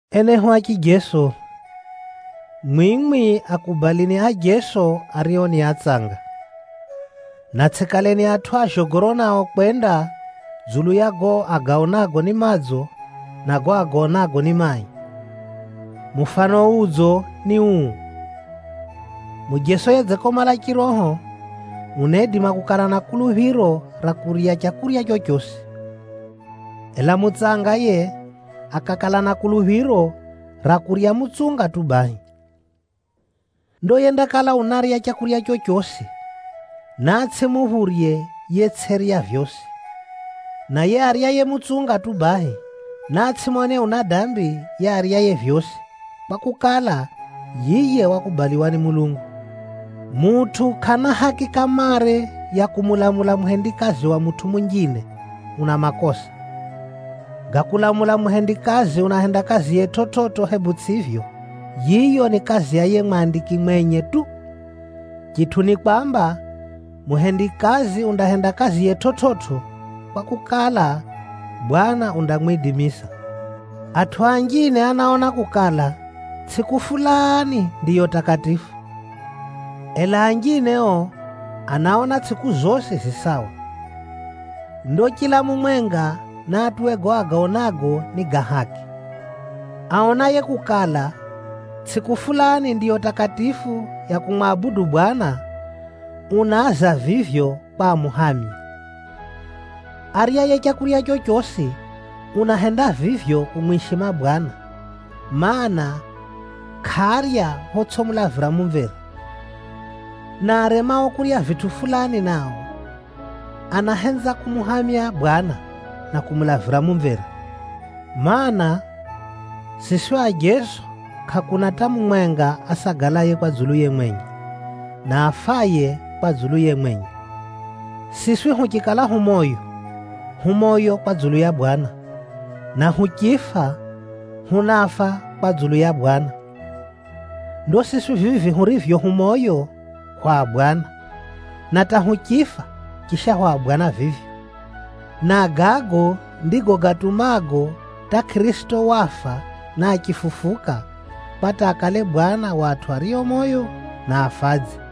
Enehu a chijeso, mwimwi akubalini ajeso ario ni atsanga. Na tsʼikaleni atʼu a zhogoro nao kwenda dzulu ya gago agaonago ni madzo, na gago agaonago ni mai. Mufano udzo ni uu: mujeso yedzikomala chiroho, unaidima kukala na kuluphiro ra kurya leu rorosi. Ela mutsanga yiye, akakala na kuluphiro ra kurya mutsunga tu bahi. Ndo yendakala unarya leu rorosi, naatsʼimuphurye yetsʼirya vyosi. Na yiye aryaye mutsunga tu bahi, naatsʼimone una dambi yiye aryaye vyosi, kwakukala, yiye wakubaliwa ni Mulungu. Mutʼu kʼana haki kamare ya kumulamula muhendikazi wa mutʼu munjine, una makosa. Ga kulamula muhendikazi unahenda kaziye chividzo hebu tsʼivyo, yiyo ni kazi ya yiye mwandiki mwenye tu. Chitʼu ni kwamba, muhendikazi undahenda kaziye chividzo, kwakukala, Bwana undamwidimisa. Atʼu anjine anaona kukala, tsʼiku fulani ndiyo takatifu. Ela anjine o, anaona tsʼiku zosi zi sawa. Ndo chila mumwenga naatuwe gago agaonago ni ga haki. Aonaye kukala, tsʼiku fulani ndiyo takatifu ya kumwabudu Bwana, unaaza vivyo kwa amuhamye. Aryaye leu rorosi, unahenda vivyo kumwishima Bwana, mana, kʼarya photsʼimulavira mumvera. Na aremao kurya vitʼu fulani nao, anahenza kumuhamya Bwana, na kumulavira mumvera. Maana, siswi ajeso kʼakuna hata mumwenga asagalaye kwa dzuluye mwenye, na afaye kwa dzuluye mwenye. Siswi huchikala hu moyo, hu moyo kwa dzulu ya Bwana, na huchifa, hunafa kwa dzulu ya Bwana. Ndo siswi vivi hurivyo hu moyo, hwa Bwana, na hata huchifa, chisha hwa Bwana vivyo. Na gago ndigo gatumago hata Kʼirisito wafa na achifufuka, kwa hata akale Bwana wa atʼu ario moyo, na afadzi.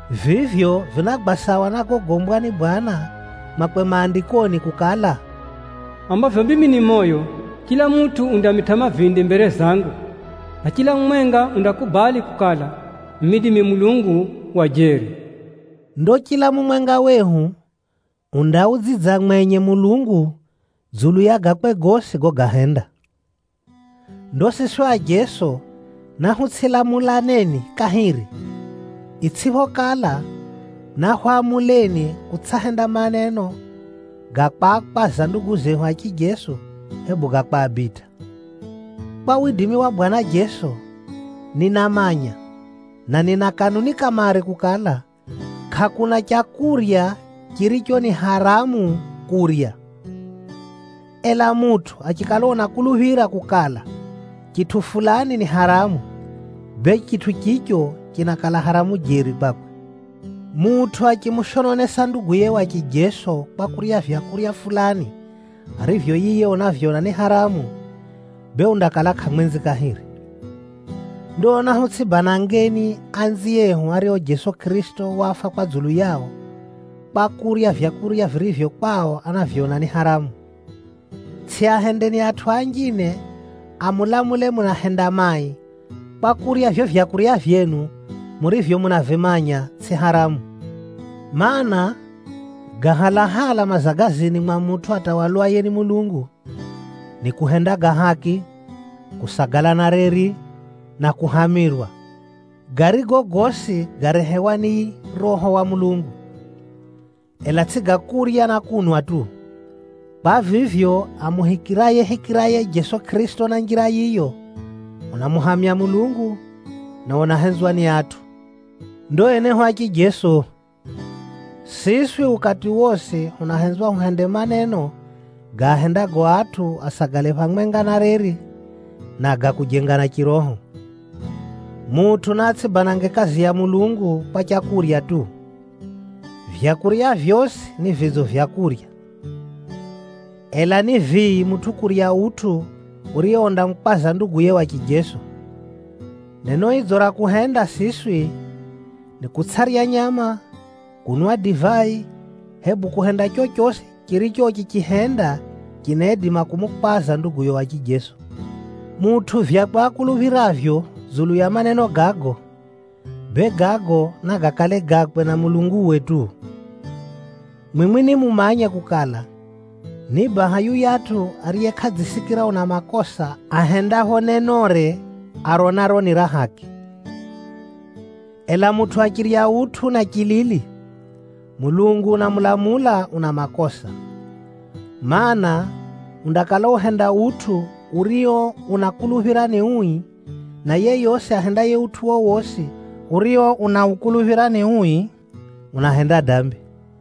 Vivyo vinagwa sawa na gogombwa ni Bwana Mulungu mwakwe Maandikoni kukala, “Dza vivyo nirivyo moyo, chila mutʼu undamitʼa mavindi mbere zangu, na chila mumwenga undakubali kukala, mimi ndimi Mulungu wa jeri.” Ndo chila mumwenga wehu undaudzidza mwenye Mulungu, dzulu ya gakwe gosi gogahenda. Ndo siswi ajeso nahutsʼilamulaneni kahiri, itsʼiphokala, nahwamuleni kutsʼahenda maneno ga kwakwaza ndugu zehu a chijeso, hebu ga kwabitʼa. Kwa widimi wa Bwana Jeso, ninamanya, na nina kanuni kamare kukala, kʼakuna leu ririro ni haramu kurya. Ela mutʼu achikala unakuluphira kukala, chitʼu fulani ni haramu, bee chitʼu chicho chinakala haramu jeri kwakwe. Mutʼu achimushononesa nduguye wa chijeso kwa kurya vyakurya fulani arivyo yiye unavyona ni haramu, bee undakala kʼamwenzi kahiri. Ndo nahutsʼibanangeni anziehu ario Jeso Kʼirisito wafa kwa dzulu yao, kwa kurya vyakurya virivyo kwao anavyona ni haramu. Tsʼiahendeni atʼu anjine amulamule munahenda mai, kwa kurya vivyo vyakurya vyenu murivyo munavimanya tsʼi haramu. Maana, ga halahala mazagazini mwa mutʼu atawalwaye ni Mulungu, ni kuhenda ga haki, kusagala na reri, na kuhamirwa, garigo gosi garehewa ni Roho wa Mulungu. Ela tsʼi ga kurya na kunwa tu! Kwa vivyo, amuhikirayehikiraye Jeso Kʼirisito na njira yiyo, unamuhamya Mulungu, na unahenzwa ni atʼu. Ndo enehu a chijeso, siswi ukati wosi hunahenzwa huhende maneno gaahendago atʼu asagale phamwenga na reri, na ga kujengana chiroho. Mutʼu naatsʼibanange kazi ya Mulungu kwa leu tu! Maleu gosi ni madzo ga kurya. Ela ni vii mutʼu kurya utʼu urio undamukwaza nduguye wa chijeso. Neno idzo ra kuhenda siswi, ni kutsʼarya nyama, kunwa divai, hebu kuhenda chochosi chiricho uchichihenda, chinaidima kumukwaza nduguyo wa chijeso. Mutʼu vyakwe akuluphiravyo dzulu ya maneno gago, bee gago nagakale gakwe na Mulunguwe tu. Mwimwi nimumanye kukala, ni baha yuyatʼu ariye kʼadzisikira una makosa ahendapho nenore aronaro ni ra haki. Ela mutʼu achirya utʼu na chilili, Mulungu unamulamula una makosa. Maana, undakala uhenda utʼu urio unakuluphira ni ui, na yeyosi ahendaye utʼu wowosi urio unaukuluphira ni ui, unahenda dambi.